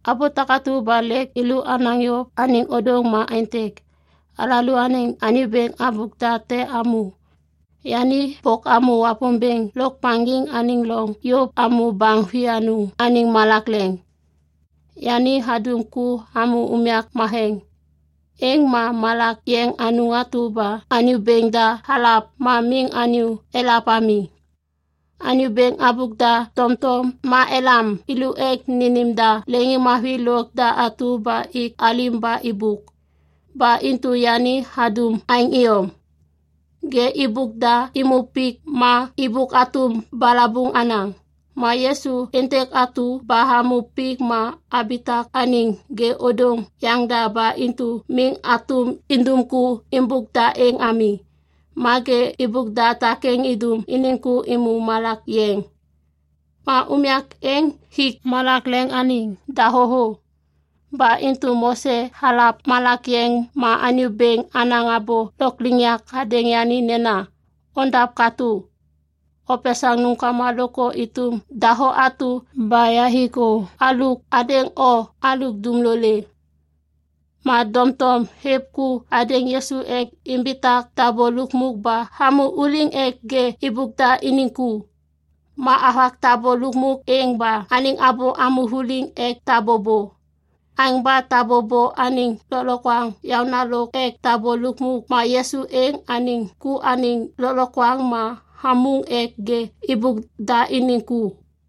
Abô takatu ba lêk yêlô anaŋ yôv anêŋ ôdôŋ ma aêntêk. Alalôaniŋ anyô bêŋ habôk da te hamô. Yani bôk hamô Wapômbêŋ Lôkmaŋgiŋ anêŋ loŋ yôv hamô baŋ vianôŋ anêŋ malak leŋ. Yani hadum ku hamô unyak matheŋ, êŋ ma malak yeŋ anôŋ atu ba Anyô Bêŋ da halav ma miŋ anyô elav ami. Anyô bêŋ habôk da tomtom ma elam thêlô ek nênêm da leŋiŋmavi lôk da atu ba ik alim ba êbôk. Ba intu yani hadum aêŋ iyom. Ŋê êbôk da êmô pik ma êbôk hatôm balabuŋ hanaŋ. Ma Yisu êntêk atu ba hamô pik ma habitak anêŋ ŋê ôdôŋ yaŋda ba intu miŋ hatôm indum ku êmbôk da êŋ ami. Ma ŋê êbôk da takêŋ idum iniŋ ku êmô malak yeŋ. Ma unyak êŋ hik malak leŋ anêŋ dahô thô. Ba intu Mose halav malak yeŋ ma Anyô Bêŋ hanaŋ abô lôkliŋyak hadêŋ yani nena, “Ondav katô. Opesaŋ nômkama lôkthô êtôm dahô atu ba yahik thô hadêŋ o halôk dumlolê.” Ma doŋtom hêv ku hadêŋ Yisu ek imbitak tabô lukmuk ba hamô vuliŋ ek ŋê êbôk da iniŋ ku. Ma havak tabô lukmuk êŋ ba anêŋ abô hamô vuliŋ ek tabô bô. Aêŋ ba tabô bô anêŋ lôklokwaŋ yaôna lôk ek tabô lukmuk ma Yisu êŋ anêŋ ku anêŋ lôklokwaŋ ma hamôŋ ek ŋê êbôk da iniŋ ku.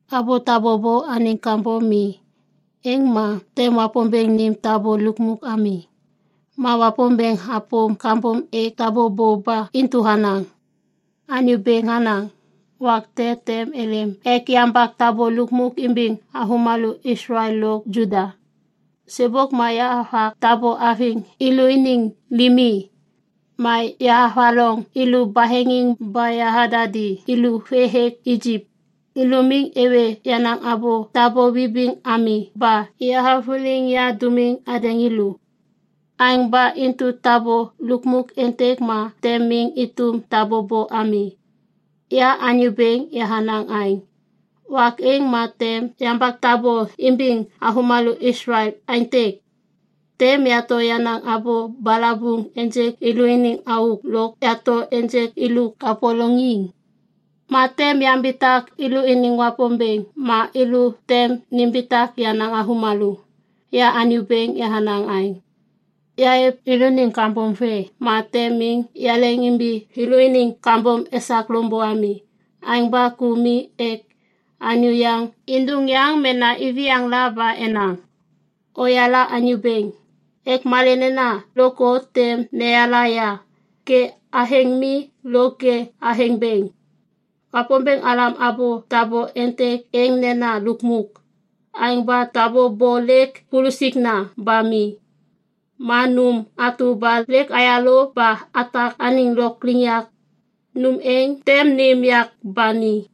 Abô tabô bô anêŋ kambom mi, êŋ ma tem Wapômbêŋ nêm tabô lukmuk ami. Ma Wapômbêŋ hapôm kambom hêk tabô bô ba intu hanaŋ, “Anyô Bêŋ hanaŋ, ‘Wak te tem êlêm ek yambak tabô lukmuk imbiŋ avômalô Islael lo Juda. Sêbôk ma yahavak tabô haviŋ thêlôniŋ limi ma yahavaloŋ thêlô baheŋiŋ ba yahadadi thêlô vê hêk Ijip. Thêlô miŋ êwê yenaŋ abô tabô vibiŋ ami ba yahavôliŋ yadômiŋ hadêŋ thêlô. Aêŋ ba intu tabô lukmuk êntêk ma tem miŋ êtôm tabô bô ami. Ya Anyô Bêŋ yahanaŋ aêŋ. Wak êŋ ma tem yambak tabô imbiŋ avômalô Islael aêntêk. Tem yato yenaŋ abô balabuŋ ênjêk thêlôniŋ auk lôk yato ênjêk thêlô kapôlôŋiŋ. Ma tem yambitak thêlôniŋ Wapômbêŋ ma thêlô tem nimbitak yenaŋ avômalô. Ya Anyô Bêŋ yahanaŋ aêŋ. Yahêv thêlôniŋ kambom vê ma tem miŋ yaleŋimbi thêlôniŋ kambom esak loŋbô ami. Aêŋ ba ku mi ek anyô yaŋ êndôŋ yaŋ mena iviyaŋ la ba enaŋ, “Oyala Anyô Bêŋ” ek malê nena lôkthô tem neyala ya, ŋê athêŋ mi lôk ŋê athêŋ bêŋ.’” Wapômbêŋ halam abô tabô êntêk êŋ nena “lukmuk”. Aêŋ ba tabô bô lêk pulusikna ba mi. Ma nôm atu ba lêk hayalôv ba hatak anêŋ lôkliŋyak, nôm êŋ tem nêm yak ba ni.